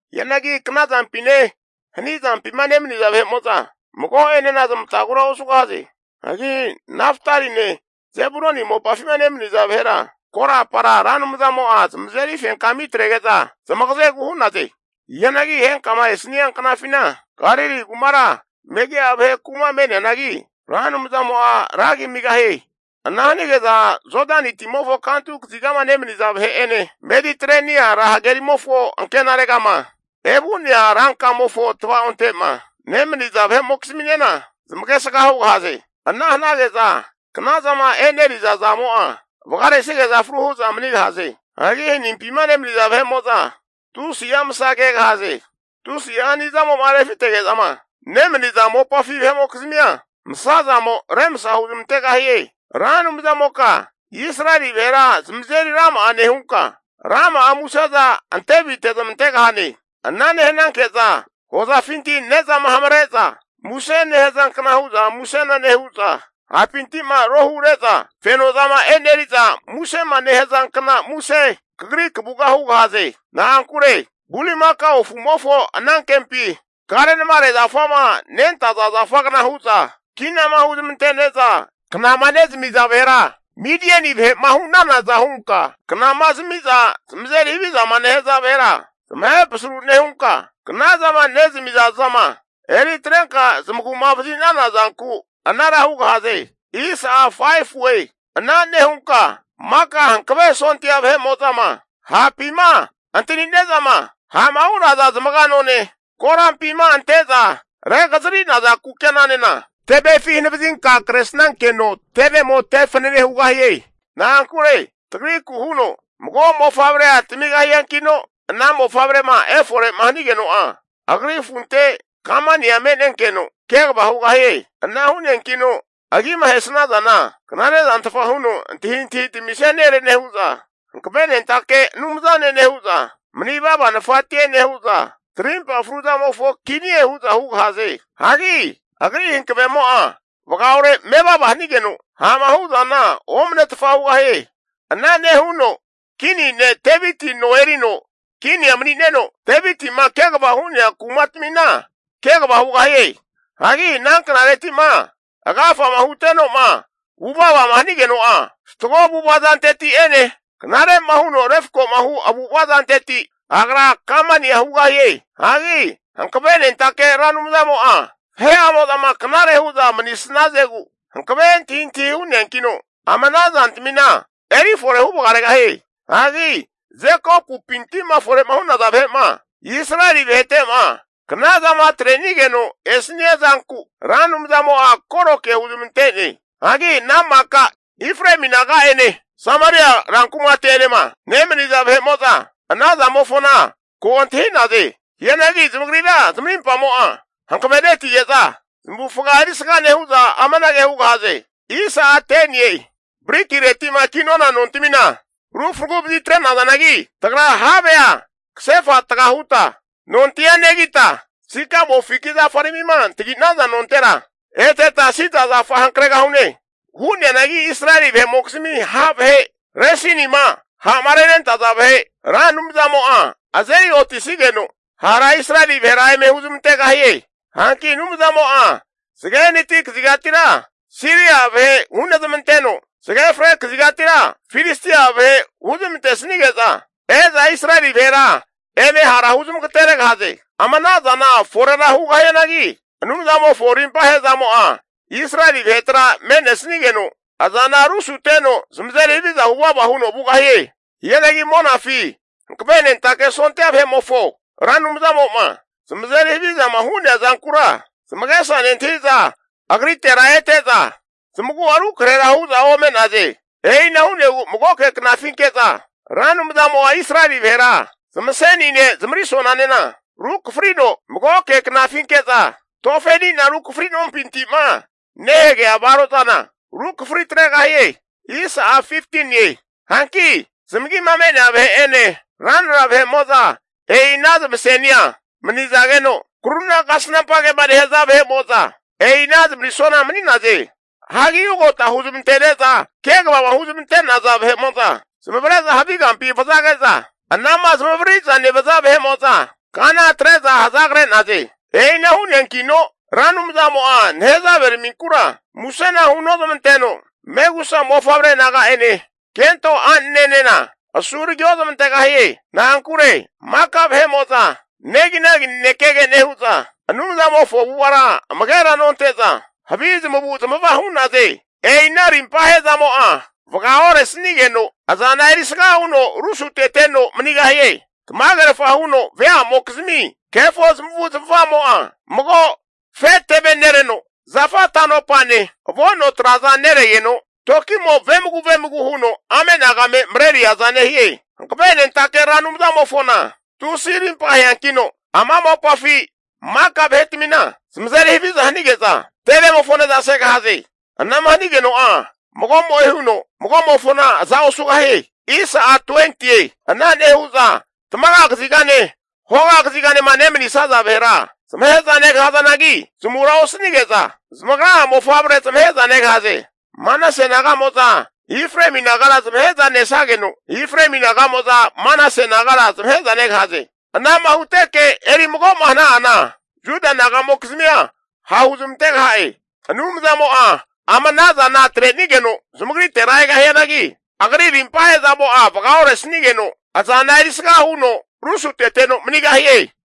Hianagi knazampine hanizampima nemaniza vahe'mo'za mago'enena zamatagura osugahaze. Hagi Naftaline Zebuluni mopafima nemaniza vahera, korapara Ra Anumzamo'a zamazeri fenkami atrege'za zamagazegu hu'naze. Hianagi henkama esania knafina, Galili kumara megi'a vahe ku'ma me'neanagi, Ra Anumzamo'a ragi amigahie. Ana hanige'za Jodani timofo kantu kazigama nemaniza vahe'ene, Mediterenia ra hagerimofo ankenaregama evu'nea rankamofo tavaonte'ma nemaniza vahe'mokizminena zamagesga hugahaze. Ana hanage'za knazama eneriza zamo'a vagaresige'za fru hu'za manigahaze. Hagi hanimpima nemaniza vahe'mo'za tusi'a masa kegahaze. Tusi'a hani zamo'ma refitege'zama nemaniza mopafi vahe'mokizmia, masazamo remsa huzmantegahie. Ra Anumzamoka Israeli vahera zamazeri rama'a nehunka, rama'a museza antevite zamantegahane. Ana nehanke'za hozafinti ne'zama nehamare'za muse nehazankna hu'za musena nehu'za, hapinti'ma rohure'za fenozama e'neriza musema nehazankna muse kagri kavuga hugahaze. Na'ankure bulimakao afumofo anankempi kare'namare zafama nentaza zafagna hu'za kinama huzmante'neza knama nezami'za vahera, Midieni vahe'ma hu'nanaza hunka knama zamiza zamazeri haviza nehaza vahera zamahe pasaru nehunka, knazama nezamiza zama eri atrenka zamagu'ma vazi'nana zanku anara hugahaze. Ana nehunka maka hankave sondia vahe'mo'zama hapima antani'nezama ha'ma hu'naza zamaga none, korampima ante'za regazari'naza kukenanena tevefi hanavazinka kresnankeno tevemo te fanene hugahie. Na'ankure tagriku huno mago mofavrea tamigahiankino, ana mofavrema efore'ma hanigeno'a, agri afunte kamania me'nenkeno kegava hugahie. Ana hu'neankino agima ahesnazana, Knare zantfa huno Antahintahi tamisia nere nehu'za, Hankavenentake Anumzane nehu'za, Manivava Nafatie nehu'za, Tarimpa fruzamofo Kinie hu'za hugahaze. Hagi Agri hankavemo'a vagaore mevava hanigeno, ha'ma hu'zana omanetfa hugahie. Ana nehuno kini ne' Deviti no erino kinia mani'neno, Deviti'ma kegava hu'nea kumatamina kegava hugahie. Hagi ana knareti'ma agafama huteno'ma vuvavama hanigeno'a, fatgo avu'ava zanteti'ene knare'ma huno refko'ma hu avu'ava zanteti, agra kamania hugahie. Hagi Hankavenentake Ra Anumzamo'a vahe'amo'zama knare hu'za manisnazegu, hankave antahintahi hu'neankino, ama ana zantamina eri fore huvagaregahie. Hagi Jekopumpinti'ma fore'ma hu'naza vahera Israeli vahete'ma knazama atre'nigeno esania zanku Ra Anumzamo'a koro ke huzmante'ne. Hagi ana maka Efraemi naga'ene Sameria rankumate'enema nemaniza vahe'mo'za, ana zamofona ko antahi'naze. Hianagi zamagrira zamarimpamo'a hankavenetige'za zamavufaga erisga nehu'za amanage hu'naze. Brikireti'ma kinona nontamina ru fragu vazitre'nazanagi, tagra havea kasefa taga huta nontia negita, sikamo fiki zafaramima antagi'naza nontera, eteta sida zafa hankregahune. Hu'neanagi Israeli vahe'mokizmi ha' vahe Resinima ha'ma renentaza vahe Ra Anumzamo'a azeri otisigeno hara Israeli vahera eme huzmantegahie. Hanki Anumzamo'a zage hanati kazigatira Siria (Aramia) vahe hunezmanteno, zage fre kazigatira Filistia vahe huzmantesnige'za e'za Israeli vahera eme hara huzmagateregahaze. Ama anazana forera hugahianagi Anumzamofo rimpa ahe'zamo'a Israeli vahetera me'nesnigeno, azana rusuteno zamazeri haviza huvava huno vugahie. Hianagi monafi hankavenentake sondia vahe'mofo Ra Anumzamo'ma zamazeri havizama hu'nea zankura, zamagesa nentahiza agritera ete'za zamagu'a rukrahera hu'za ome'naze. E'ina hu'negu magoke knafinke'za Ra Anumzamo'a Israeli vahera zamasenine zamarisonanena runekafrino, magoke knafinke'za tofe ani'na rukafrino nompintima nehagea varozana rukafri atregahie. Hanki zamagima me'nea vahe'ene, ranra vahe'mo'za e'i ana zamasenia manizageno, kruna kasnampa kema nehaza vahe'mo'za e'i ana zamarisona mani'naze. Hagi ugota huzmante'neza kegavama huzmante'naza vahe'mo'za zamavare'za havi kampi vazage'za, anama zamavariri'za nevaza vahe'mo'za kana atre'za hazagre'naze. E'ina hu'neankino Ra Anumzamo'a nehazave raminkura musena hunozmanteno, megusa mofavre naga'ene kento a'nenena asuragi ozmantegahie. Na'ankure maka vahe'mo'za neginagi nanekege nehu'za, Anumzamofo avu'avara amagera nonte'za havi zamavu'zamava hu'naze. E'ina rimpa ahe'zamo'a vagaoresnigeno, azana erisga huno rusuteteno manigahie. Tamagerfa huno veamokizmi kefo zamavu zamava'mo'a mago afe teve nereno, zafa tanopane avo'no traza neregeno toki'mo vemagu vemagu huno ame'nagame mareneriaza nehie. Hankavenentake Ra Anumzamofona tusi arimpa aheankino, ama mopafi maka vahetamina zamazeri haviza hanige'za, tevemofo ne'za segahaze. Anama hanigeno'a mago'mo'e huno mago'mofona aza osugahie. Ana nehu'za tamaga kazigane hoga kazigama nemanisaza vahera zamahe'za negahazanagi zamura osanige'za zamagra'a mofavre zamahe'za negahaze. Manase naga'mo'za Efraemi nagara zamahe'za nesageno, Efraemi naga'mo'za Manase nagara zamahe'za negahaze. Anama huteke eri mago'ma hana'ana, Juda nagamokizmia hahu zamantegaha'e. Anumzamo'a ama anazana atrenigeno zamagritera egahianagi, Agri rimpa ahe'zamo'a vaga oresanigeno, azana erisga huno rusuteteno manigahie.